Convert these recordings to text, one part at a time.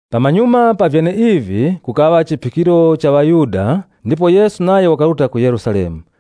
Pamanyuma pa vyeneivi, kukaŵa chiphikiro cha ŵaYuda ndipo Yesu nayo wakaruta ku Yerusalemu.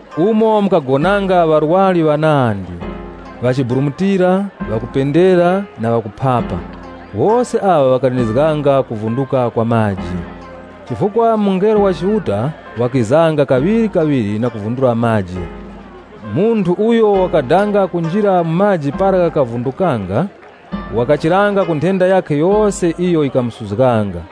Umu mukagonanga ŵarwari ŵanandi: ŵachiburumutira, ŵakupendera na ŵakuphapa. [Wose aŵa ŵakalindizganga kuvunduka kwa maji. Chifukwa mungelo wa Chiuta wakizanga kaŵirikaŵiri na kuvundura maji. Munthu uyo wakadanga kunjira mu chiziŵa para ghakavundukanga, wakachiranga ku nthenda yakhe yose iyo yikamusuzganga.]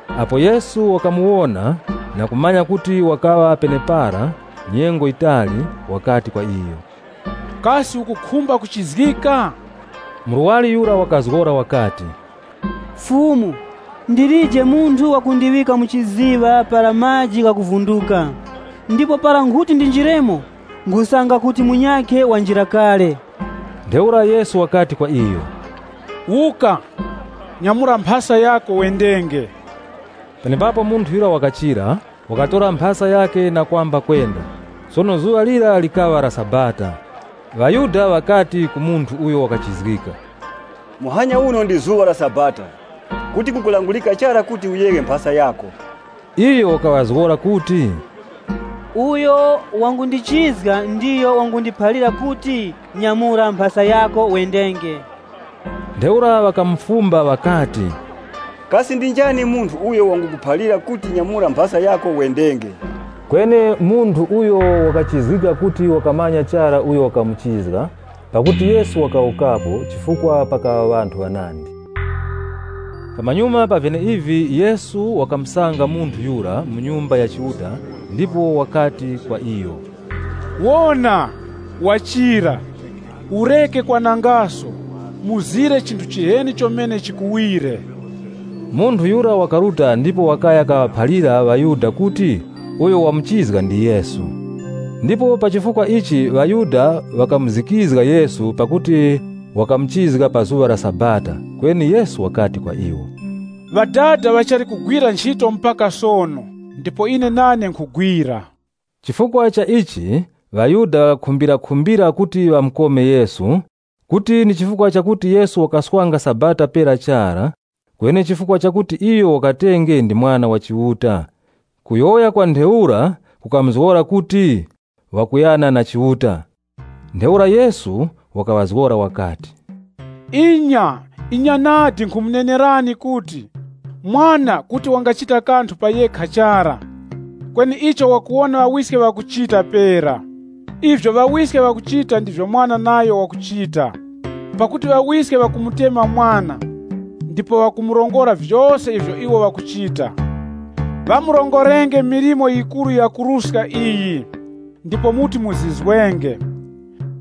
Apo Yesu wakamuwona na kumanya kuti wakaŵa penepara nyengo yitali, wakati kwa iyo, “Kasi ukukhumba kuchizgika?” Murwari yura wakazgora wakati, “Fumu, ndilije munthu wakundiŵika mu chiziŵa para maji ghakuvunduka. Ndipo para nkhuti ndinjiremo, nkhusanga kuti munyakhe wanjira kale.” Ntheura Yesu wakati kwa iyo, “Wuka, nyamura mphasa yako wendenge.” Penepapo munthu yura wakachira, wakatora mphasa yakhe, na kwamba kwenda. Sono zuŵa lira likaŵa la Sabata ŴaYuda ŵakati ku munthu uyo wakachizgika, “Muhanya uno ndi zuŵa la Sabata, kuti kukulangurika chara kuti uyeghe mphasa yako.” Iyo wakaŵazgora kuti, “Uyo wangundichizga ndiyo wangundiphalira kuti nyamura mphasa yako wendenge.” Ntheura ŵakamufumba ŵakati, “Kasi ndi njani munthu uyo wangukuphalira kuti nyamura mphasa yako wendenge?” Kweni munthu uyo wakachizgika kuti wakamumanya chara uyo wakamuchizga, pakuti Yesu wakawukapo pakuti pakaŵa ŵanthu ŵanandi. Pamanyuma pa vyeneivi Yesu wakamusanga munthu yura mu Nyumba ya Chiuta, ndipo wakati kwa iyo, “Wona, wachira. Ureke kwanangaso, chinthu chiheni chomene chikuwire.” Munthu yura wakaruta ndipo wakaya kaŵaphalira ŵaYuda kuti uyo wamuchizga ndi Yesu. Ndipo pa chifukwa ichi ŵaYuda ŵakamuzikizga Yesu pakuti wakamuchizga pa zuŵa la Sabata. Kweni Yesu wakati kwa iwo, “Ŵadada ŵachali kuteŵeta mlimo mpaka sono ndipo ine nane nkhuteŵeta.” Chifukwa cha ichi, ŵaYuda ŵakakhumbirakhumbira kuti ŵamukome Yesu, kuti ndi chifukwa chakuti Yesu wakaswanga Sabata pera chara, kweni nchifukwa chakuti iyo wakatenge ndi Mwana wa Chiuta. Kuyowoya kwa ntheura kukamuzgora kuti wakuyana na Chiuta. Ntheura Yesu wakaŵazgora wakati, “Inya, inya nadi, nkhumunenerani kuti, Mwana, kuti wangachita kanthu pa yekha chara, kweni icho wakuwona Ŵawiske ŵakuchita pera. Ivyo Ŵawiske ŵakuchita ndivyo Mwana nayo wakuchita. Pakuti Ŵawiske ŵakumutemwa Mwana ndipo ŵakumurongora vyose ivyo iwo ŵakuchita. Ŵamurongorenge milimo yikuru yakuruska iyi, ndipo muti muzizwenge.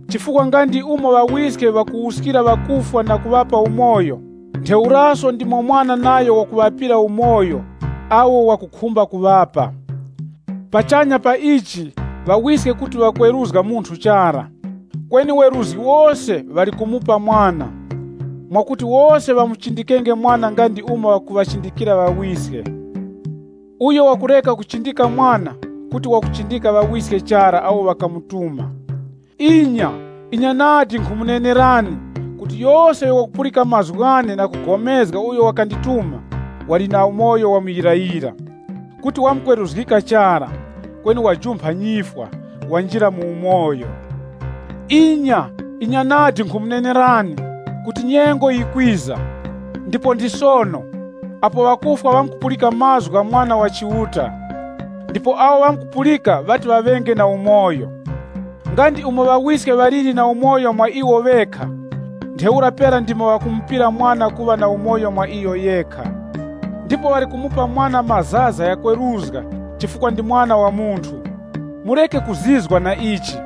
Chifukwa nga ndi umo Ŵawiske ŵakuwuskira ŵakufwa na kuŵapa umoyo, ntheuraso ndimo Mwana nayo wakuŵapira umoyo awo wakukhumba kuŵapa. Pachanya pa ichi, Ŵawiske kuti ŵakweruzga munthu chara, kweni weruzgi wose ŵali kumupa Mwana. Mwakuti wose ŵamuchindikenge Mwana nga ndi umo ŵakuŵachindikira Ŵawiske. Uyo wakureka kuchindika Mwana, kuti wakuchindika Ŵawiske chara awo ŵakamutuma.” “Inya, inya nadi, nkhumunenerani kuti yose uyo wakupulika mazgu ghane na kupulikana na uyo wakandituma, wali na umoyo wa muyirayira. Kuti wamkweruzgika chara, kweni wajumpha nyifwa, wanjira mu umoyo. Inya, inya nadi, nkhumunenerani kuti nyengo yikwiza, ndipo ndi sono, apo ŵakufwa ŵamkupulika mazgu gha Mwana wa Chiuta. Ndipo awo ŵamkupulika ŵati ŵaŵe na umoyo. Nga ndi umo Ŵawiske ŵaliri na umoyo mwa iwo ŵekha, ntheura pera ndimo ŵakamupira Mwana kuŵa na umoyo mwa iyo yekha. Ndipo ŵali kumupa Mwana mazaza ghakweruzga chifukwa ndi Mwana wa Munthu. Mureke kuzizwa na ichi,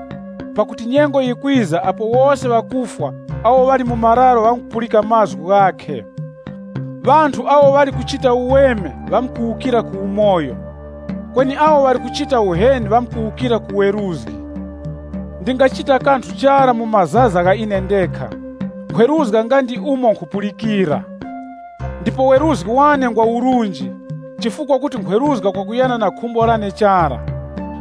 pakuti nyengo yikwiza apo wose ŵakufwa awo ŵali mu mararo ŵamkupulika mazgu ghakhe. Ŵanthu awo ŵali kuchita uweme ŵamkuwukira ku umoyo, kweni awo ŵali kuchita uheni ŵamkuwukira ku ŵeruzgi. “Ndingachita kanthu chara mu mazaza gha ine ndekha. Nkhweruzga nga ndi umo nkhupulikira. Ndipo weruzgi wane ngwa urunji chifukwa kuti nkhweruzga kwakuyana na khumbo lane chara,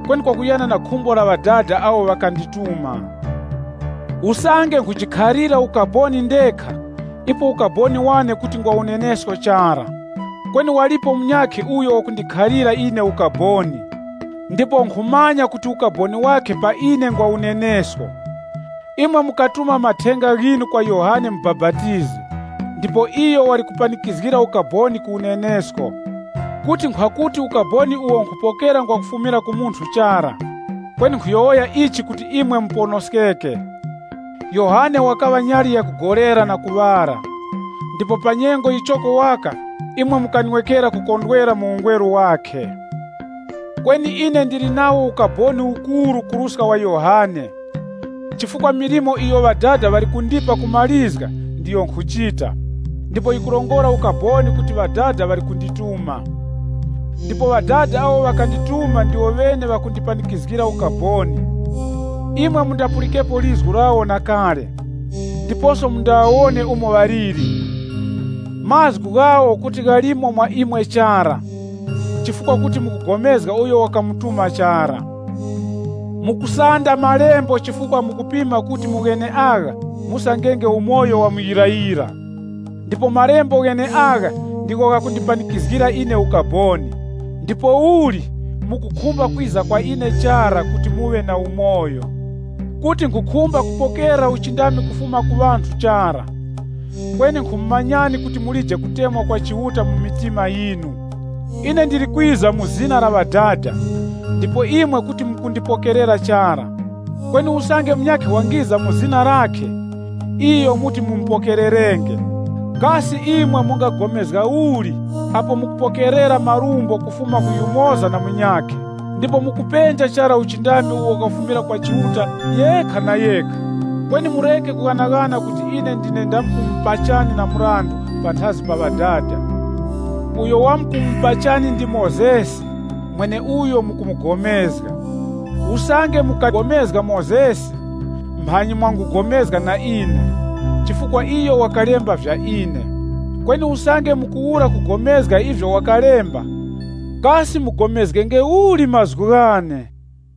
kweni kwakuyana na khumbo la Ŵadada awo ŵakandituma. “Usange nkhujikhalira ukaboni ndekha, ipo ukaboni wane kuti ngwa unenesko chara. Kweni walipo munyakhe uyo wakundikhalira ine ukaboni, ndipo nkhumanya kuti ukaboni wakhe pa ine ngwa unenesko. Imwe mukatuma mathenga ghinu kwa Yohane Mubapatizi ndipo iyo wali kupanikizgira ukaboni ku unenesko. Kuti nkhwakuti ukaboni uwo nkhupokera ngwa kufumira ku munthu chara, kweni nkhuyowoya ichi kuti imwe muponoskeke. Yohane wakaŵa nyali yakugolera na kuŵala, ndipo pa nyengo yichoko waka imwe mukanwekera kukondwera mu ungweru wakhe. Kweni ine ndili nawo ukaboni ukuru kuruska wa Yohane. Chifukwa milimo iyo Ŵadada ŵali kundipa kumarizga, ndiyo nkhuchita, ndipo yikurongora ukaboni kuti Ŵadada ŵali kundituma. Ndipo Ŵadada awo ŵakandituma ndiwo ŵene ŵakundipanikizgira ukaboni. Imwe mundapulikepo lizgu lawo na kale, ndiposo mundaŵawone umo ŵaliri. Mazgu ghawo kuti ghalimo mwa imwe chara, chifukwa kuti mukupulikana na uyo ŵakamutuma chara. Mukusanda malembo chifukwa mukupima kuti mu gheneagha musangenge umoyo wa muyirayira. Ndipo malembo gheneagha ndigho ghakundipanikizgira ine ukaboni. Ndipouli, mukukhumba kwiza kwa ine chara kuti muŵe na umoyo. “Kuti nkhukhumba kupokera uchindami kufuma ku ŵanthu chara, kweni nkhumumanyani kuti mulije kutemwa kwa Chiuta mu mitima yinu. Ine ndili kwiza mu zina la Ŵadada, ndipo imwe kuti mukundipokerera chara. Kweni usange munyakhe wangiza mu zina lakhe, iyo muti mumupokererenge. Kasi imwe mungapulikana uli apo mukupokerera marumbo kufuma ku yumoza na munyakhe ndipo mukupenja chara uchindami uwo ukufumira kwa Chiuta yekha na yekha? Kweni mureke kughanaghana kuti ine ndine ndamkumupachani na mrandu panthazi pa Ŵadada. Uyo wamkumupachani ndi Mozesi, mweneuyo mukumugomezga. Usange mukapulikana na Mozesi, mphanyi mwangupulikana na ine, chifukwa iyo wakalemba vya ine. Kweni usange mukuwura kupulikana na ivyo wakalemba, kasi mupulikanenge uli mazgu ghane?”